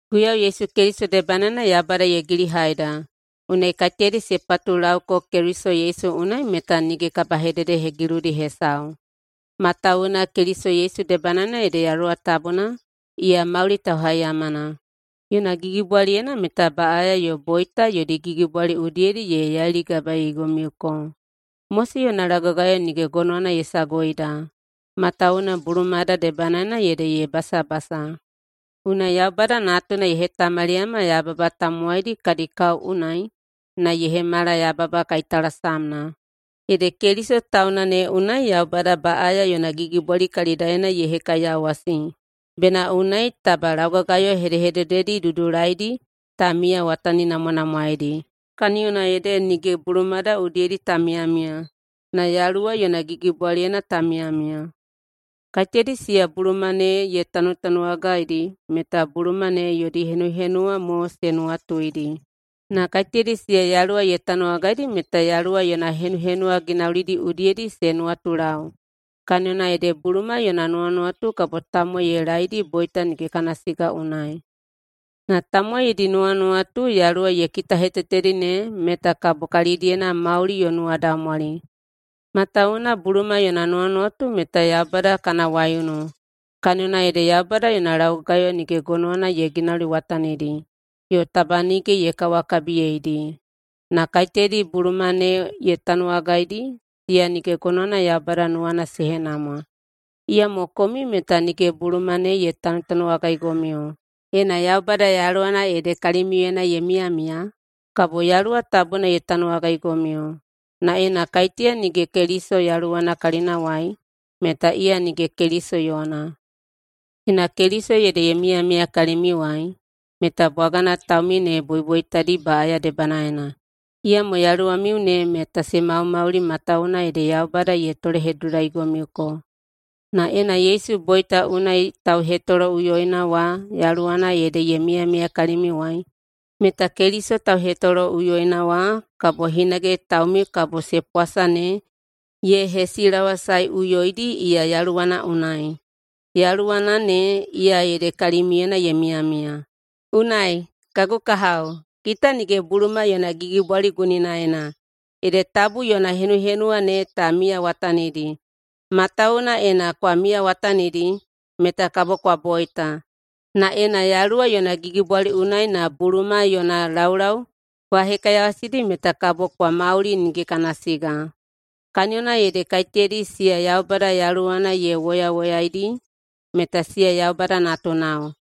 [Guiyau Yesu Keliso debanaena Yaubada ye gilihaida.] Unai kaiteyadi se patulauko Keliso Yesu unai meta nige kabahededehegiludi hesau. Matawuwuna Keliso Yesu debanaena ede Yaluwa Tabuna, iya mauli tauhaiyamana, yona gigibwaliyena meta baꞌaya yo boita yodi gigibwali udiyedi ye yailigabaeigomiuko. Mose yona laugagayo nige gonowana ye saguida, matawuwuna bulumada debanaena ede ye basabasa. Unai Yaubada Natuna ye hetamaliyama yababa tamowaidi kadi kao unai na ye hemala yababa kaitalasamna. Ede Keliso tauna ne unai Yaubada baꞌaya yona gigibwali kalidaena ye hekaiyawasi, bena unai taba laugagayo hedehedededi dudulaidi ta miyawataninamwanamwaeidi, kaniyona ede nige bulumada udiyedi ta miyamiya, na Yaluwa yona gigibwaliyena ta miyamiya. Kaiteyadi siya buluma ne ye tanutanuwagaidi meta buluma ne yodi henuhenuwa mo se nuwatuidi. Na kaiteyadi siya Yaluwa ye tanuwagaidi meta Yaluwa yona henuhenuwa ginaulidi udiyedi se nuwatulau. Kaniyona ede buluma yona nuwanuwatu kabo tamowai ye laeidi boita nige kana siga unai. Na tamowai yodi nuwanuwatu Yaluwa ye kitahetetedi ne meta kabo kalidiyena mauli yo nuwadaumwali. Matawuwuna buluma yona nuwanuwatu meta Yaubada kana waiunu, kaniyona ede Yaubada yona laugagayo nige gonowana ye ginauliwatanidi yo taba nige ye kawakabiyeidi. Na kaiteyadi buluma ne ye tanuwagaidi, siya nige gonowana Yaubada nuwana se henamwa. Iyamo komiu meta nige buluma ne ye tanutanuwagaigomiu. Ena Yaubada Yaluwana ede kalimiuyena ye miyamiya, kabo Yaluwa Tabuna ye tanuwagaigomiu. Na ena kaiteya nige Keliso Yaluwana kalinawai, meta iya nige Keliso yona. Ena Keliso ede ye miyamiya kalimiuwai, meta bwagana taumiu ne boiboitadi baꞌaya debanaena, iyamo yaluwamiu ne meta se maumauli matawuwuna ede Yaubada ye tolehedudulaigomiuko. Na ena Yesu boita unai tauhetoloꞌuyoina wa Yaluwana ede ye miyamiya kalimiuwai, meta Keliso tauhetoloꞌuyoina wa kabo hinage taumiu kabo se pwasa ne ye hesilawasaeꞌuyoidi iya Yaluwana unai. Yaluwana ne, iya ede kalimiuyena ye miyamiya. Unai, kagu kahao, kita nige buluma yona gigibwali guninaena, ede tabu yona henuhenuwa ne ta miyawatanidi. Matawuwuna ena kwa miyawatanidi, meta kabo kwa boita. Na ena Yaluwa yona gigibwali unai na buluma yona laulau kwa hekaiyawasidi meta kabo kwa mauli nige kana siga. Kaniyona ede kaiteyadi siya Yaubada Yaluwana ye woyawoyaidi, meta siya Yaubada natunao.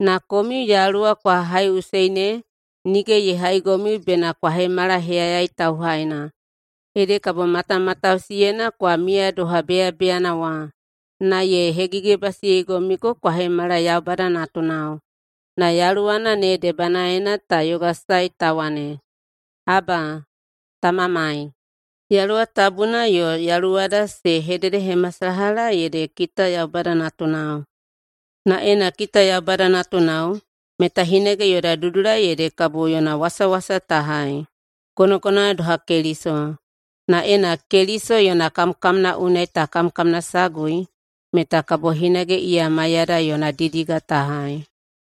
Na komiu Yaluwa kwa haiꞌusei ne, nige ye haigomiu bena kwa hemala heyayai tauhaina, ede kabo matamatausiyena kwa miya doha beyabeyana wa. Na ye hegigibasiyeigomiu kwa hemala Yaubada natunao. Na Yaluwana ne debanaena ta yogasae ta wane, “Aba, Tamamai!” Yaluwa Tabuna yo yaluwada se hededehemasalaha ede kita Yaubada natunao. Na ena kita Yaubada natunao, meta hinage yoda dudulai ede kabo yona wasawasa ta hai, gonogonowana doha Keliso. Na ena Keliso yona kamkamna unai ta kamkamnasagui meta kabo hinage iya maiyada yona didiga ta hai.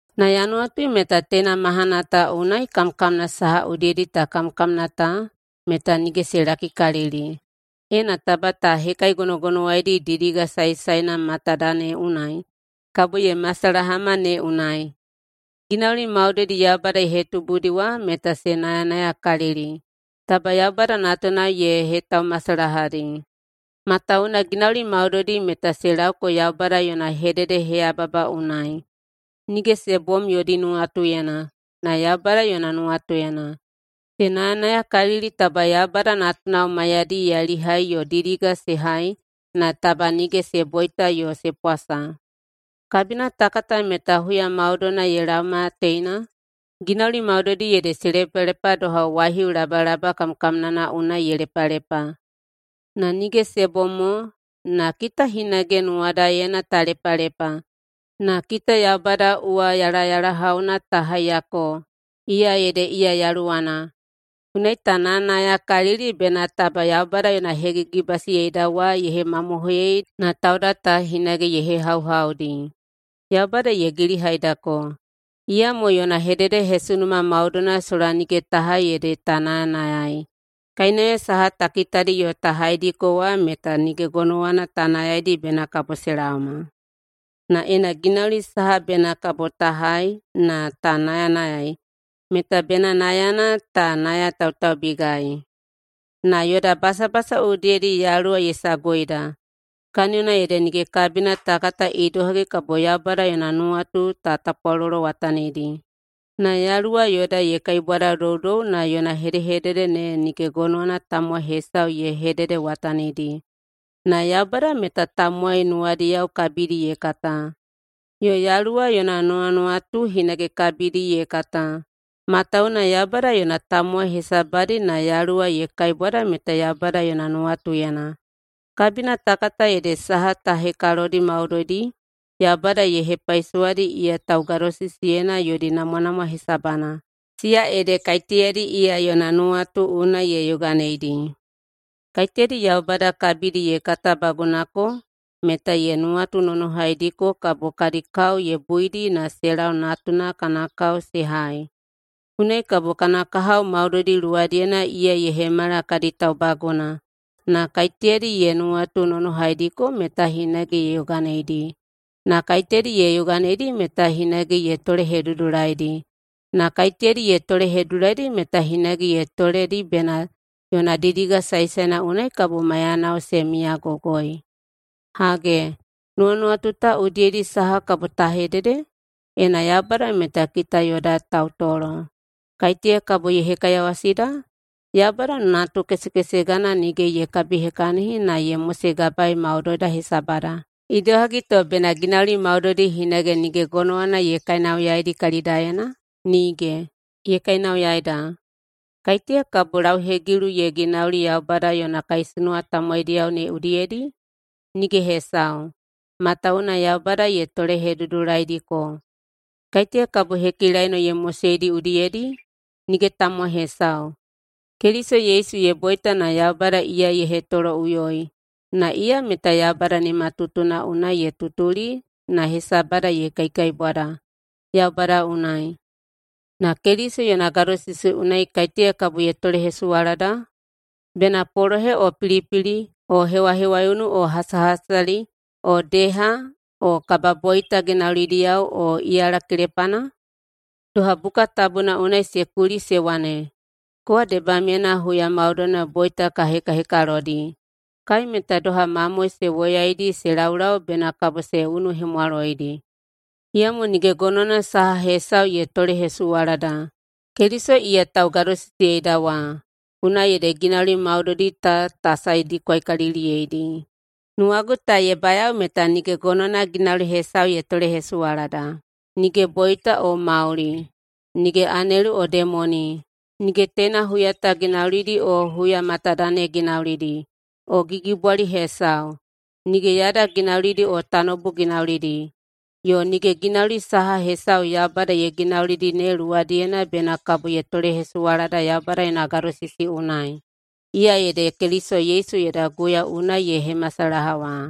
Na ya nuwatui meta teina mahana ta unai kamkamna saha udiyedi ta kamkamna ta meta nige se lakikalili, ena taba ta hekaigonogonowaidi didiga saesaena matada ne unai kabo ye masalahama ne unai. Ginauli maudoidi Yaubada ye hetubudi wa meta se nayanayakalili taba Yaubada natunao ye hetaumasalahadi. Matawuwuna ginauli maudoidi meta se laoko Yaubada yona hededeheyababa unai, nige se bom yodi nuwatuyena, na Yaubada yona nuwatuyena. Se nayanayakalili taba Yaubada natunao maiyadi yailihai yo didiga se hai na taba nige se boita yo se pwasa. Kabina ta kata meta huya maudoina ye laoma teina, ginauli maudoidi ede se lepalepa doha waihiu labalaba kamkamnana unai ye lepalepa. Na nige se bom mo, na kita hinage nuwadaena ta lepalepa, na kita Yaubada uwayalayalahauna ta haiyako, iya ede iya Yaluwana. Unai ta nayanayakalili bena taba Yaubada yona hegigibasiyeida wa ye hemamohoiyei na tauda ta hinage ye hehauhaudi. Yaubada ye gilihaidako, iyamo yona hededehesunuma maudoina sola nige ta hai ede ta nayanayai. Kainauya saha ta kitadi yo ta haidiko wa meta nige gonowana ta nayaidi bena kabo se laoma. Na ena ginauli saha bena kabo ta hai na ta nayanayai, meta bena nayana ta nayatautaubigai. Na yoda basabasa udiyedi Yaluwa ye saguida. Kaniyona ede nige kabina ta kata idohagi kabo Yaubada yona nuwatu ta tapwalolowatanidi. Na Yaluwa yoda ye kaibwadadoudou na yona hedehedede ne nige gonowana tamowai hesau ye hededewatanidi. Na Yaubada meta tamowai nuwadiyao kabidi ye kata, yo Yaluwa yona nuwanuwatu hinage kabidi ye kata, matawuwuna Yaubada yona tamowai hesabadi na Yaluwa ye kaibwada meta Yaubada yona nuwatuyena. Kabina ta kata ede saha ta hekalodi maudoidi Yaubada ye hepaisowadi iya taugadosisiyeina yodi namwanamwa hesabana, siya ede kaiteyadi iya yona nuwatu unai ye yoganeidi. Kaiteyadi Yaubada kabidi ye katabagunako meta ye nuwatunonohaidiko kabo kadi kao ye buidi na se lau Natuna kana kao se hai. Unai kabo kana kahao maudoidi luwadiyena iya ye hemala kadi taubaguna. Na kaiteyadi ye nuwatunonohaidiko meta hinage ye yoganeidi. Na kaiteyadi ye yoganeidi meta hinage ye tolehedudulaidi. Na kaiteyadi ye tolehedudulaidi meta hinage ye toledi bena yona didiga saesaena unai kabo maiyanao se miyagogoi. Hage, nuwanuwatu ta udiyedi saha kabo ta hedede? Ena Yaubada meta kita yoda tautolo, kaiteya kabo ye hekaiyawasida? Yaubada natukesekesegana nige ye kabihekahini na ye mosegabaei maudoida hesabada. Idohagi to bena ginauli maudoidi hinage nige gonowana ye kainauyaidi kalidaena? Nige! Ye kainauyaida! Kaiteya kabo lauhegilu ye ginauli Yaubada yona kaisunuwa tamowaidiyao ne udiyedi? Nige hesau, matawuwuna Yaubada ye tolehedudulaidiko. Kaiteya kabo hekilaino ye moseidi udiyedi? Nige tamowai hesau. Keliso Yesu ye boita na Yaubada iya ye hetoloꞌuyoi, na iya meta Yaubada nimatutuna unai ye tutuli na hesabada ye kaikaibwada Yaubada unai. Na Keliso yona gadosisi unai kaiteya kabo ye tolehesuwalada? Bena polohe o pilipili o hewahewaiunu o hasahasali o deha o kababoita ginaulidiyao o iyala kelepana? Doha buka tabuna unai se kuli se wane, “Kowa debamyena huya maudoina boita ka hekahekalodi. Kai meta doha mamoe se woyaidi se laulau bena kabo se unuhemwaloidi.” Iyamo nige gonowana saha hesau ye tolehesuwalada! Keliso iya taugadosisiyeida wa, unai ede ginauli maudoidi ta ta saedikwakaliliyeidi. Nuwagu ta ye bayao meta nige gonowana ginauli hesau ye tolehesuwalada, nige boita o mauli, nige anelu o demoni, nige teina huya ta ginaulidi o huya matada ne ginaulidi, o gigibwali hesau, nige yada ginaulidi o tanoubu ginaulidi, yo nige ginauli saha hesau Yaubada ye ginaulidi ne luwadiyena bena kabo ye tolehesuwalada Yaubada yona gadosisi unai, iya ede Keliso Yesu yoda Guiyau unai ye hemasalaha wa.